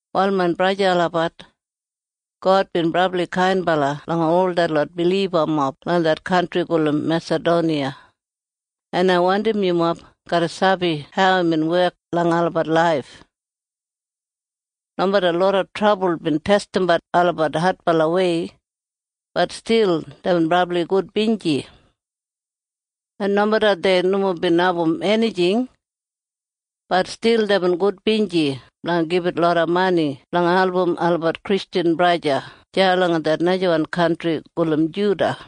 Wal main braja en sista olabat, God bin brabli kainbala langa ol detlot bilibamob langa det kantri gulum Mesadoniya, en ai wandim yumob garra sabi hau imbin wek langa olabat laif. Nomeda loda trabul bin testimbat olabat adbalawei, bat stil deibin brabli gudbinji. En nomeda dei nomo bin abum enijing, bat stil deibin gudbinji blanga gibit loda mani blanga album olabat Kristjan braja en sista deya langa det najawan kantri gulum Judiya.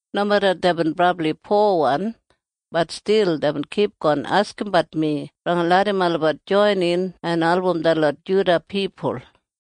Nomeda deibin brabli powan, bat stil deibin kipgon askimbat mi blanga larram olabat joinin en album detlot Judiya pipul.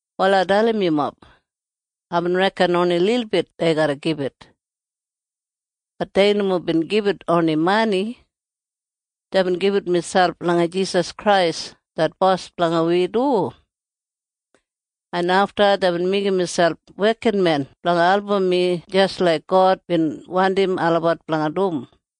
Wal ai dalim yumob. Aibin reken oni lilbit dei garra gibit. Bat dei nomo bin gibit oni mani. Deibin gibit miselp langa Jisas Krais det Bos blanga wi du. En afta deibin meigim miselp wekinmen blanga album mi jis laik God bin wandim olabat blanga dum.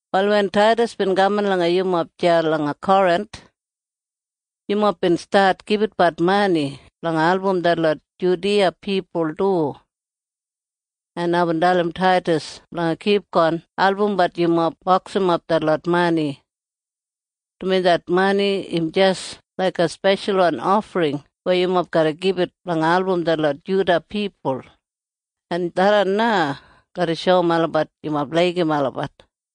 Wal wen Taidas bin kaman langa yumob deya langa Korinth, yumob bin stat gibitbat mani blanga album detlot Judiya pipul du. En aibin dalim Taidas blanga kipgon albumbat yumob boksimap detlot mani, dumaji det mani im jis laiga speshalwan ofring weya yumob garra gibit blanga album detlot Judiya pipul, en tharran na garra shoum olabat yumob laigim olabat.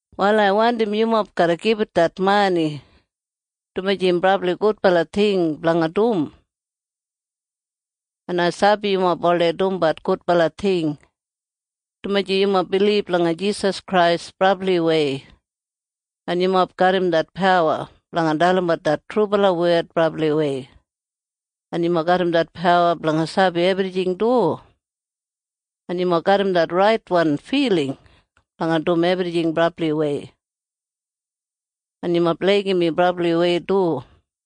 Wal ai wandim yumob garra gibit det mani, dumaji im brabli gudbala ting blanga dum. En ai sabi yumob oldei dumbat gudbala ting, dumaji yumob bilib langa Jisas Krais brabliwei, en yumob garram det pawa blanga dalimbat det trubala wed brabliwei, en yumob garram det pawa blanga sabi ebrijing du, en yumob garram det raitwan filing blanga dum ebrijing brabliwei. En yumob laigim mi brabliwei du.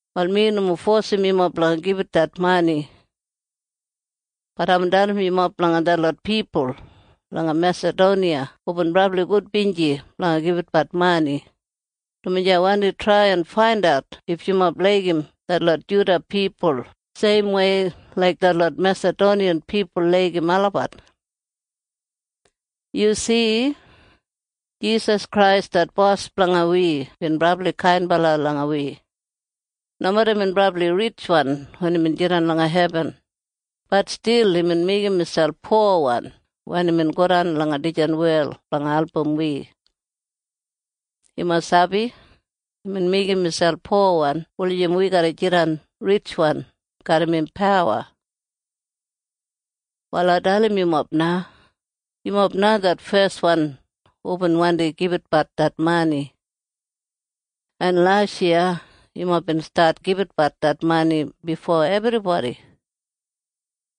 Wal mi nomo fosim yumob blanga gibit det mani. Bat aibin dalim yumob blanga detlot pipul langa Mesadoniya hubin brabli gudbinji blanga gibitbat mani, dumaji ai wandi trai en faindat if yumob laigim detlot Juda pipul seimwei laik detlot Mesadoniya pipul laigim olabat. Yu si? Jisas Krais det Bos blanga wi bin brabli kainbala langa wi. Nomeda imbin brabli ritjwan wen imbin jidan langa hebin, bat stil imbin meigim miselp powan wen imbin godan langa dijan wel blanga album wi. Yumob sabi? Imbin meigim miselp powan wulijim wi garra jidan ritjwan garram im pawa. Wal ai dalim yumob na. Yumob na det feswan hubin wandi gibitbat det mani. En lasyiya yumob bin stat gibitbat det mani bifo ebribodi.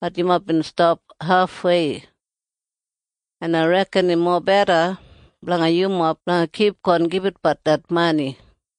Bat yumob bin stap hafwei. En ai reken im mobeda blanga yumob blanga kipgon gibitbat det mani.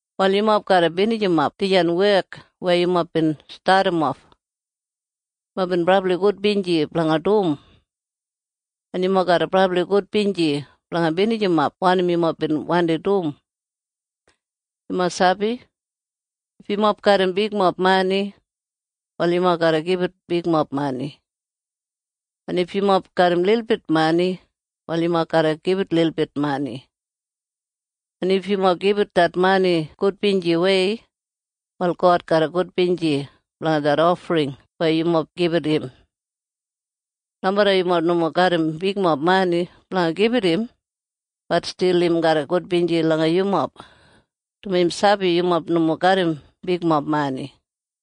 Wal yumob garra binijimap dijan wek weya yumob bin stadimof. Yumob bin brabli gudbinji blanga dum. En yumob garra brabli gudbinji blanga binijimap wanim yumob bin wandi dum. Yumob sabi? If yumob garram bigmob mani, wal yumob garra gibit bigmob mani. En if yumob garram lilbit mani, wal yumob garra gibit lilbit mani. En if yumob gibit det mani gudbinjiwei, wal God garra gudbinji blanga det ofring weya yumob gibit im. Nomeda yumob nomo garram bigmob mani blanga gibit im, bat stil im garra gudbinji langa yumob, dumaji im sabi yumob nomo garram bigmob mani.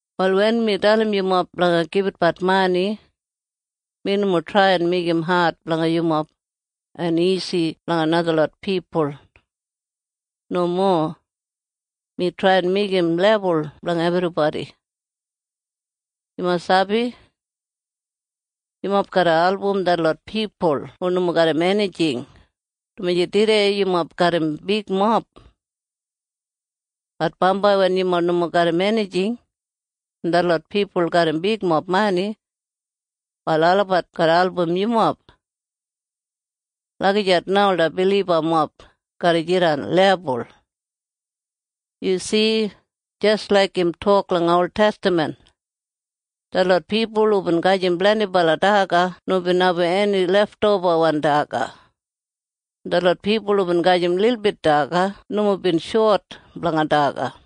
Wal wen mi dalim yumob blanga gibitbat mani, mi nomo trai en meigim ad blanga yumob en isi blanga najalot pipul. Nomo. Mi trai en meigim lebul blanga ebribodi. Yumob sabi? Yumob garra album detlot pipul hu nomo garram enijing, dumaji tudei yumob garram bigmob. Bat bambai wen yumob nomo garram enijing, en detlot pipul garram bigmob mani, wal olabat garra album yumob. Lagijat na ola bilibamob garra jidan lebul. Yu si? Jis laik im tok langa oltestaman, “Detlot pipul hubin gajim blendibala daga nomo bin abum eni leftobawan daga, en detlot pipul hubin gajim lilbit daga nomo bin shot blanga daga.”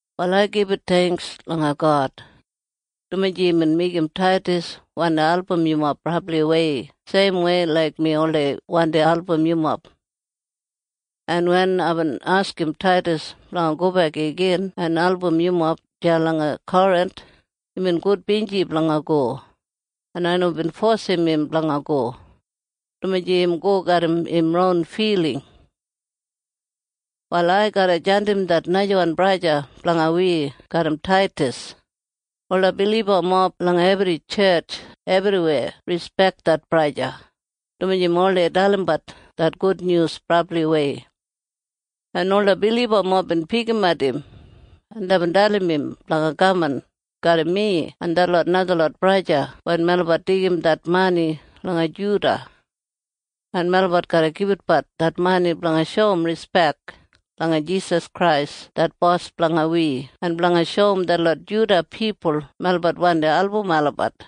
Wal ai gibit theingks langa God, dumaji imbin meigim Taidas wandi album yumob brabliwei seimwei laik mi oldei wandi album yumob. En wen aibin askim Taidas blanga gobek igin en album yumob deya langa Korinth, imbin gudbinji blanga go, en ai nomo bin fosim im blanga go, dumaji im go garram im ron filing. Wal ai garra jandim det najawan braja blanga wi garram Taidas. Ola bilibamob langa ebri tjetj ebriweya rispek det braja, dumaji im oldei dalimbat det gudnyus brabliwei, en ola bilibamob bin pikimat im, en deibin dalim im blanga kaman garram mi en detlot najalot braja wen melabat deigim det mani langa Judiya, en melabat garra gibitatbat det mani blanga shoum rispek langa Jisas Krais det Bos blanga wi en blanga shoum detlot Judiya pipul melabat wandi album olabat.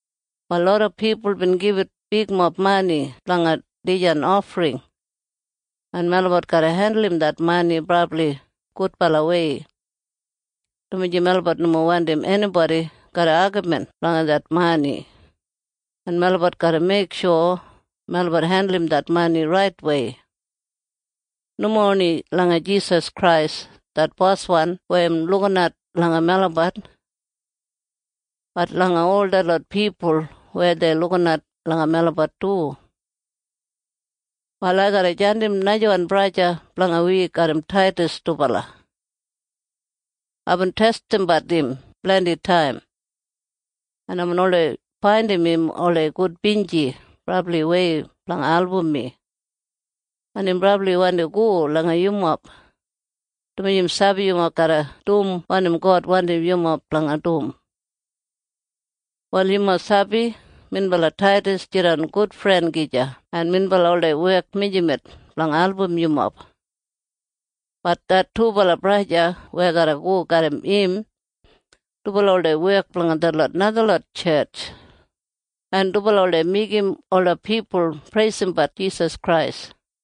Wal loda pipul bin gibit bigmob mani blanga dijan ofring, en melabat garra hendulum det mani brabli gudbalawei, dumaji melabat nomo wandim enibodi garra agamin blanga det mani, en melabat garra meiksho melabat hendulum det mani raitwei. Nomo oni langa Jisas Krais det Boswan weya im lukinat langa melabat. Bat langa ol detlot pipul weya dei lukinat langa melabat du. Wal ai garra jandim najawan braja blanga wi garram Taidas dubala. Aibin testimbat im blendi taim, en aibin oldei faindim im oldei gudbinji brabliwei blanga album mi. En im brabli wandi go langa yumob, dumaji im sabi yumob garra dum wanim God wandim yumob blanga dum. Wal yumob sabi minbala Taidas jidan gudfren gija en minbala oldei wek mijamet blanga album yumob. Bat det dubala braja weya garra go garram im, dubala oldei wek blanga detlot najalot tjetj, en dubala oldei meigim ola pipul preisimbat Jisas Krais.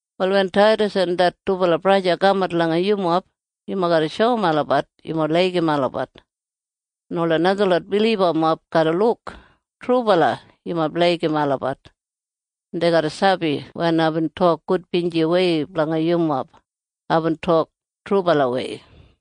Wal wen Taidas en det dubala braja kamat langa yumob, yumob garra shoum olabat yumob laigim olabat, en ola najalot bilibamob garra luk trubala yumob laigim olabat, en dei garra sabi wen aibin tok gudbinjiwei blanga yumob, aibin tok trubalawei.